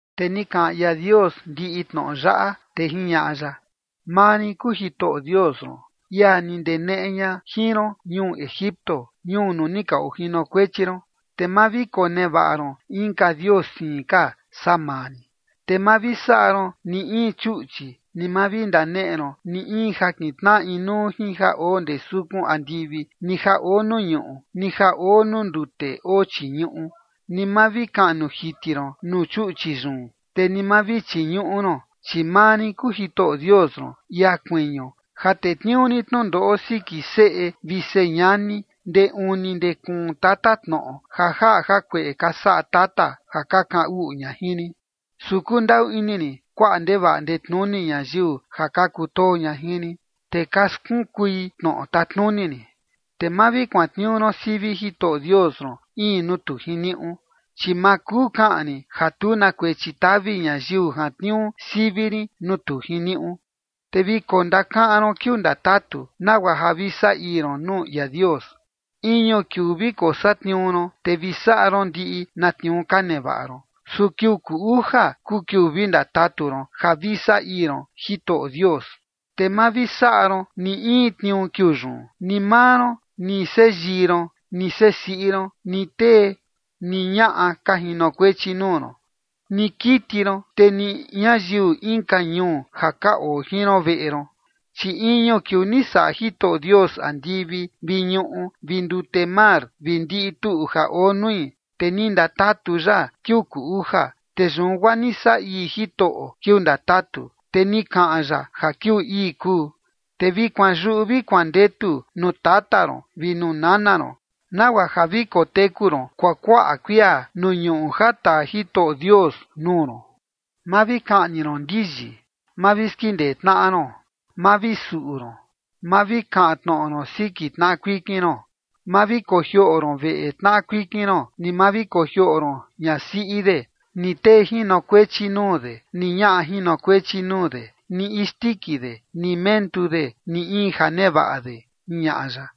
Te ni kaꞌan ia Dios ndiꞌi tnoꞌo yaꞌa, te jiñaꞌa ya: ―Maa rin kuu Jitoꞌo Dios ron, ia ni ndeneꞌe ña jin ron ñuu Egipto, ñuu nuu ni ka ojinokuechi ron. Te ma vi konevaꞌa ron inka dios siin ka saa maa rin. ’Te ma vi saꞌa ron ni in chuꞌchi, ni ma vi ndaneꞌe ron ni in ja kintnaꞌa inuu jin ja oo ndee sukun andivi, ni ja oo nuu ñuꞌu, ni ja oo nuu ndute oo chii ñuꞌu. Ni ma vi kaꞌnu jiti ron nuu chuꞌchi yun, te ni ma vi chiñuꞌu ron, chi maa rin kuu Jitoꞌo Dios ron, ia kuiñu, ja tetniuu rin tnundoꞌo siki seꞌe vi señani ndee uni ndee kuun tatatnoꞌo ja jaꞌa jakueꞌe ka saꞌa tata ja ka kaꞌan uꞌu ña jin rin. Su kundaꞌu ini rin kuaꞌa ndevaꞌa ndetnuni ñayiu ja ka kutoo ña jin rin, te ka skunkui tnoꞌo tatnuni rin. ’Te ma vi kuantniuu ron sivi Jitoꞌo Dios ron in nuu tu jiniuꞌu, chi ma kuu kaꞌan rin ja tu na kuechi tavi ñayiu jantniuu sivi rin nuu tu jiniuꞌu. ’Te vi kondakaꞌan ron kiuu ndatatu, nagua ja vi saꞌa ii ron nuu ia Dios. Iñu kiuu vi kosatniuu ron, te vi saꞌa ron ndiꞌi na tniuu ka nevaꞌa ron. Su kiuu kuu uja kuu kiuu vi ndatatu ron ja vi saꞌa ii ron Jitoꞌo Dios. Te ma vi saꞌa ron ni in tniuu kiuu yun, ni maa ron, ni seꞌe yii ron, ni seꞌe siꞌi ron, ni tee ni ñaꞌa ka jinokuechi nuu ron, ni kiti ron, te ni ñayiu inka ñuu ja ka oo jin ron veꞌe ron. Chi iñu kiuu ni saꞌa Jitoꞌo Dios andivi vi ñuꞌu vi ndute mar vi ndiꞌi tuꞌu ja oo nui. Te ni ndatatu ya kiuu kuu uja. Te yun guaa ni saꞌa ii Jitoꞌo kiuu ndatatu, te ni kaꞌan ya ja kiuu ii kuu. ’Te vi kuanyuꞌu vi kuandetu nuu tata ron vi nuu nana ron, nagua ja vi koteku ron kuakuaꞌa kuia nuu ñuꞌu ja taa Jitoꞌo Dios nuu ron. ’Ma vi kaꞌni ron ndiyi. ’Ma vi skindee tnaꞌa ron. ’Ma vi suꞌu ron. ’Ma vi kaꞌan tnoꞌo ron siki tnaꞌa kuikin ron. ’Ma vi kojioꞌo ron veꞌe tnaꞌa kuikin ron, ni ma vi kojioꞌo ron ñasiꞌi de, ni tee jinokuechi nuu de, ni ñaꞌa jinokuechi nuu de, ni isndiki de, ni mentu de, ni in ja nevaꞌa de ―jiñaꞌa ya.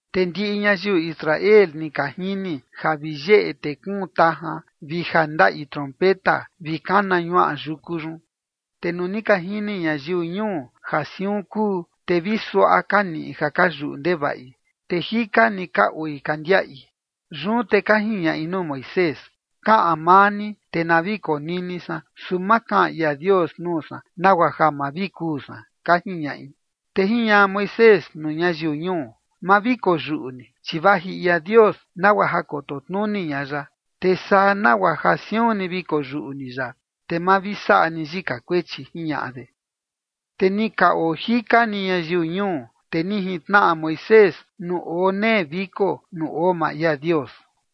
Te ndiꞌi ñayiu Israel ni ka jini ja vi yeꞌe te kuun tajan, vi ja ndaꞌi trompeta, vi kana ñuaꞌa yuku yun. Te nuu ni ka jini ñayiu ñuu ja siun kuu, te vi suaꞌa ka niꞌi ja ka yuꞌu ndevaꞌi, te jika ni ka oi ka ndiaꞌi. Yun te ka jiñaꞌi nuu Moisés: ―Kaꞌan maa ni, te na vi konini san, su ma kaꞌan ia Dios nuu san, nagua ja ma vi kuu san ―ka jiñaꞌi. Te jiñaꞌa Moisés nuu ñayiu ñuu: ―Ma vi koyuꞌu ni, chi vaji ia Dios nagua ja koto tnuni ña ya, te saa nagua ja siun ni vi koyuꞌu ni ya, te ma vi saꞌa ni yika kuechi ―jiñaꞌa de. Te ni ka oo jika ni ñayiu ñuu, te ni jintnaꞌa Moisés nuu oo nee viko nuu oo maa ia Dios.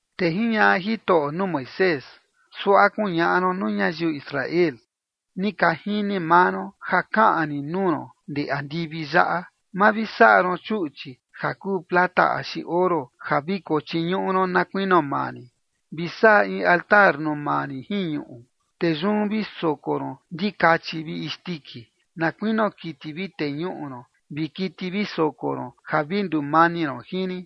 Te jiñaꞌa Jitoꞌo nuu Moisés: ―Suaꞌa kuñaꞌa ron nuu ñayiu Israel: “Ni ka jini maa ron ja kaꞌan rin nuu ron ndee andivi yaꞌa. Ma vi saꞌa ron chuꞌchi ja kuu plata axi oro ja vi kochiñuꞌu ron na kuinio maa rin. Vi saꞌa in altar nuu maa rin jin ñuꞌu, te yun vi soko ron ndikachi vi isndiki, na kuinio kiti vi teñuꞌu ron vi kiti vi soko ron ja vi ndumani ron jin rin.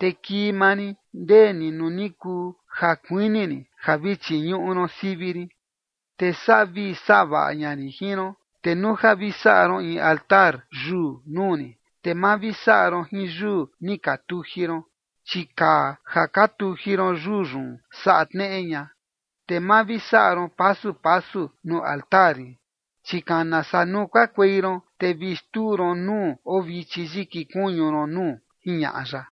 Te kii maa rin ndee ni nuu ni kuu ja kuini rin ja vi chiñuꞌu ron sivi rin, te saꞌa vii saꞌa vaꞌa ña rin jin ron. Te nuu ja vi saꞌa ron in altar yuu nuu rin, te ma vi saꞌa ron jin yuu ni ka tuji ron, chi kaa ja ka tuji ron yuu yun saꞌa tneꞌe ña. Te ma vi saꞌa ron pasu pasu nuu altar rin, chi kana saa nuu kakuei ron, te vi xtuu ron nuu oo vichi yiki kuñu ron nuu” ―jiñaꞌa ya.